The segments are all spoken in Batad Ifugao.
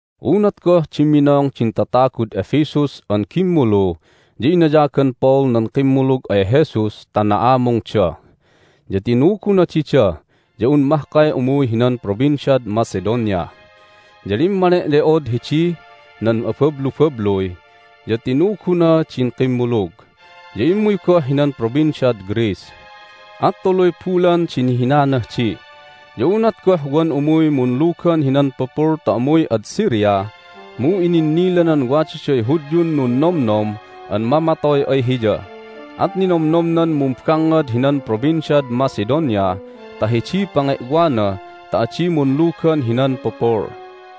Unat goh dimminong din tatagud Ephesus an gimmulu ya inayagan Paul nan kimmulug ay Jesus ta na'amungda. Ya tinuguna dida ya un mahkay umuy hinan Provinciad Macedonia. Ya limmane'le'od hidih nan abablubabluy, ya tinuguna din kimmulug. Ya immuy goh hinan Provinciad Greece, at tuluy bulan di nihinanah di. Ya unat goh wan umuy munlugan hinan pupul ta umuy ad Syria mu ininnilanan wadaday Hudyun nunnomnom an mamatoy ay hiya at ninomnomnan mumbangngad hinan Provinciad Macedonia ta hidiy pange'wana ta adi munlugan hinan pupul.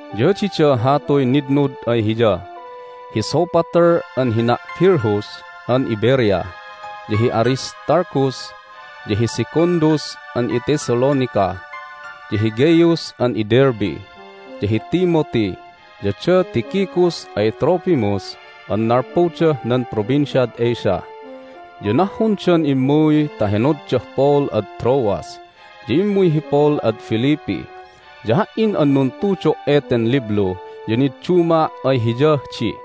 Ya dida hatuy nitnud ay hiya: hi Sopater an hina' Pyrrhus an iBerea, ya hi Aristarchus, ya hi Secundus an iThessalonica, ya hi Gaius an iDerbe, ya hi Timothy, ya da Tychicus ay Trophimus an nalpudah nan Provinciad Asia. Ya nahhundan immuy ta henoddah Paul ad Troas. Ya immuy hi Paul ad Philippi, ya ha"in an nuntudo' eten liblu ya nidduma' ay hiyah di.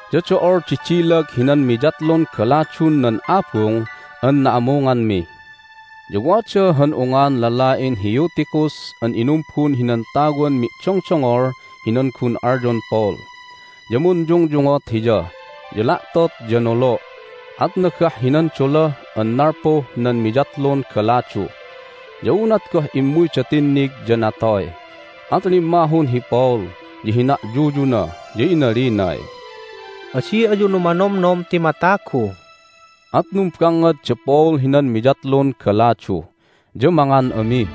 Ya do'ol di dilag hinan miyatlun galadun nan abung an na'amunganmi. Ya wada han ungan lala'in hi Eutychus an inumbun hinan tawan mi'dongdongol hinan gun alyon Paul. Ya munyungyungot hiya, ya la'tot ya nolo', at nagah hinan dola an nalpuh nan miyatlun galadu. Ya unat goh immuyda tinnig ya natoy. At limmahun hi Paul, ya hina'yuyuna, ya inalinay, "Adi ayu numanomnom ti matagu!" At numbangngad da Paul hinan miyatlun galadu, ya mangan ami.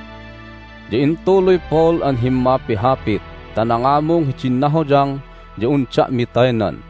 Ya intuluy Paul an himmapihapit ta nangamung hidin nahoyang ya un da'mi taynan.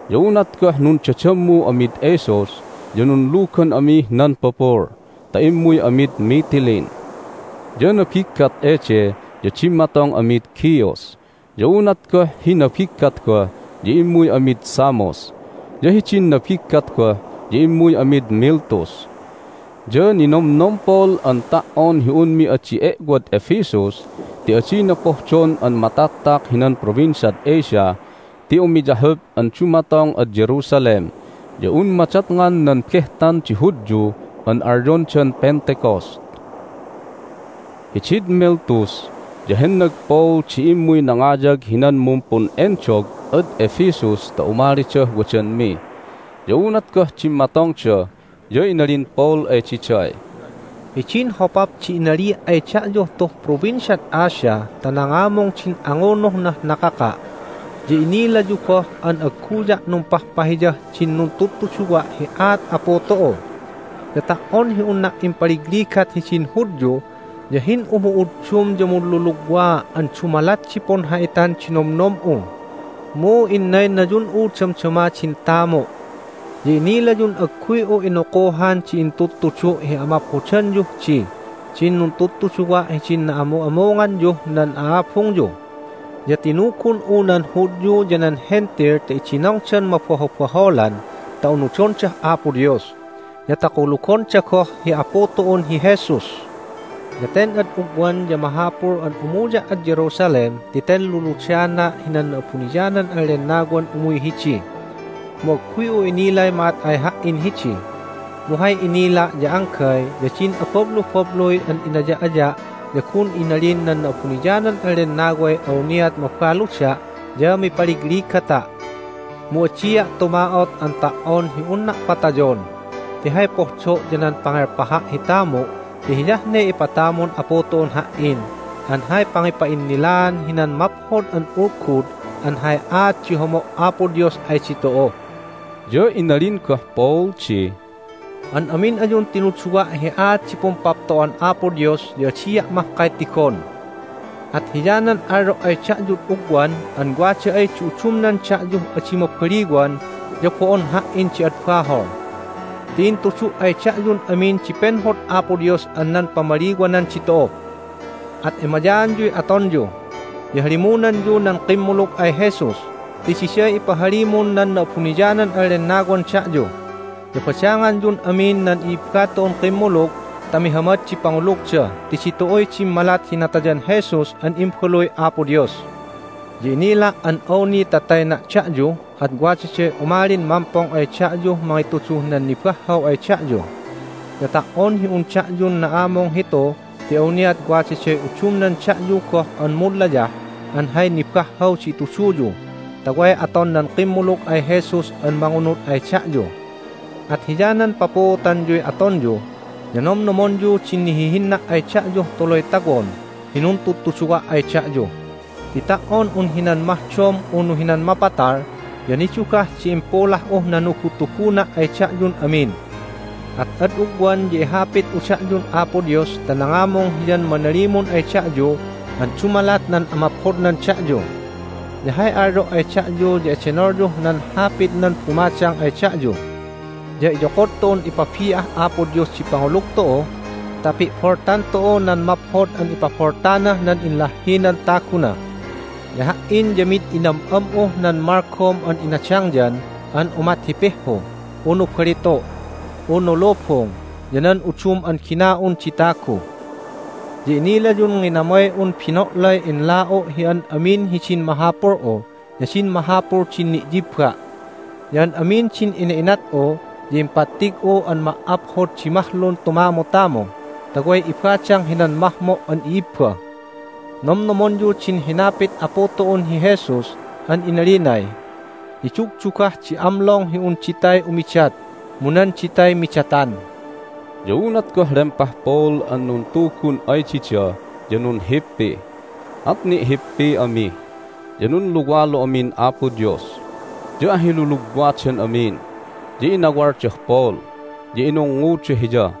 Ya unat goh nundadammu amid Assos ya nunlugan amih nan pupul ta immuy amid Mitylene. Ya nabiggat ede ya dimmatong amid Chios. Ya unat goh hi nabiggat goh ya immuy amid Samos, ya hidin nabiggat goh ya immuy amid Miletus. Ya ninomnom Paul an ta"on hi unmi adi e'wad Ephesus ti adina pohdon an mataktak hinan Provinciad Asia ti umiyahup an dumatong ad Jerusalem ya un madatngan nan behtan di Hudyu an alyondan Pentecost. Hidid Miletus ya hennag Paul di immuy nangayag hinan mumpun'endog ad Ephesus ta umalidah wadanmi. Ya unat goh dimmatongda ya inalin Paul ay diday, "Hidin hopap di inalia' ay da'yuh tuh Provinciad Asia ta nangamung din angunuhnah nakaka' ya inilayu goh an agguya' numpahpahiyah din nuntudtuduwa' hi aat Apu tu'u. Ya ta"on hi unna impaligligat hidin Hudyu ya hin'umu'uddum ya munlulugwaa' an dumalat di punha'itan di nomnom'u, mu innaynayun'u damdama din tamu'. Ya inilayun agguy'u inukuhan di intudtudu' hi amaphodanyuh dih din nuntudtuduwa' hidin na'amu'amunganyuh nan a'abungyu. Ya tinugun'u nan Hudyu ya nan Hentil ta idinongdan mabahobaholan ta unudondah Apo Dios, ya ta kulugonda goh hi Apu tu'un hi Jesus. Ya ten ad ugwan ya mahapul an umuya' ad Jerusalem ti ten luludana' hinan Na'abuniyanan an Lennawan umuy hidi, mu agguy'u inilay ma'at ay ha"in hidi. Mu hay inila' ya anggay ya din abablubabluy an inaya'aya' ya gun inalin nan Na'abuniyanan an Lennaway awniat mabaluda' ya mipaligligata'. Mu adia' tuma'ot an ta"on hi unna' patayon, ti hay pohdo' ya nan pangelpaha' hi tamu' ti hiyah ne ipatamun Apu tu'un ha"in an hay pangipa'innilaan hinan Maphod an Ulgud an hay aat di homo' Apo Dios ay ditu'u." Ya inalin goh Paul di, "An amin ayun tinuduwa' hi aat di Pumpapto'an Apo Dios ya adia' mahkay tigon. At hiyanan alyo' ay da'yud ugwan an wada ay di udumnan da'yuh adi mabaliwan ya bo'on ha"in di ad bahol ti intudu' ay da'yun amin di penhod Apo Dios an nan pamaliwanan ditu'u. At emayaanyuy atonyu, ya halimunanyu nan kimmulug ay Jesus ti diday ipahalimun nan Na'abuniyanan an Lennawan da'yu. Ya badanganyun amin nan i'ibba tu'un kimmulug ta mihamad di pangulugda ti ditu'uy dimmalat hi natayan Jesus an Imbaluy Apo Dios. Ya inila' an awni ta tayna' da'yu at wadaday umalin mampong ay da'yuh mangituduh nan nibahhaw ay da'yu. Ya ta"on hi un da'yun na'amung hitu ti awniat wadaday udumnan da'yu goh an munlayah an hay nibahhaw di ituduyu ta way aton nan kimmulug ay Jesus an mangunud ay da'yu. At hiyanan papuutanyuy atonyu, ya nomnomonyu din nihihinna' ay da'yuh tuluy tawon hi nuntudutuduwa' ay da'yu, ti ta"on un hinan mahdom unu hinan mapatal ya nidugah di impulah'uh nanugutuguna' ay da'yun amin. At ad ugwan ya ihapit'u da'yun Apo Dios ta nangamung Hiyan manalimun ay da'yu an dumalat nan amaphodnan da'yu, ya hay alyo' ay da'yu ya edenolyuh nan Hapitnan bumadang ay da'yu. Ya iyokod tu'un ipabi'ah Apo Dios di pangulug tu'u ta pi'boltan tu'u nan maphod an ipaboltanah nan inlahhinan taguna. Ya ha"in ya mid inam'am'uh nan malgom an inadangyan an umat hi pihhu, unu balitu', unu lubung, ya nan udum an gina'un di tagu. Ya inilayun nginamay'un bino'lay inla'u' hi an amin hidin mahapul'u ya din mahapul din ni'yibba'. Ya an amin din ina'inat'u ya impattig'u an ma"aphod di mahlun tumamutamu ta way ibadang hinan mahmo' an i'ibba. Nomnomonyu din hinapit Apu tu'un hi Jesus an inalinay, Nidugdugah di amlong hi un ditay umidat mu nan ditay midatan." Ya unat goh lempah Paul an nuntugun ay dida ya nunhippi, at ni'hippi ami, ya nunluwalu amin Apo Dios. Ya ahilulugwadan amin, ya inawaldah Paul, ya inungnguda hiya.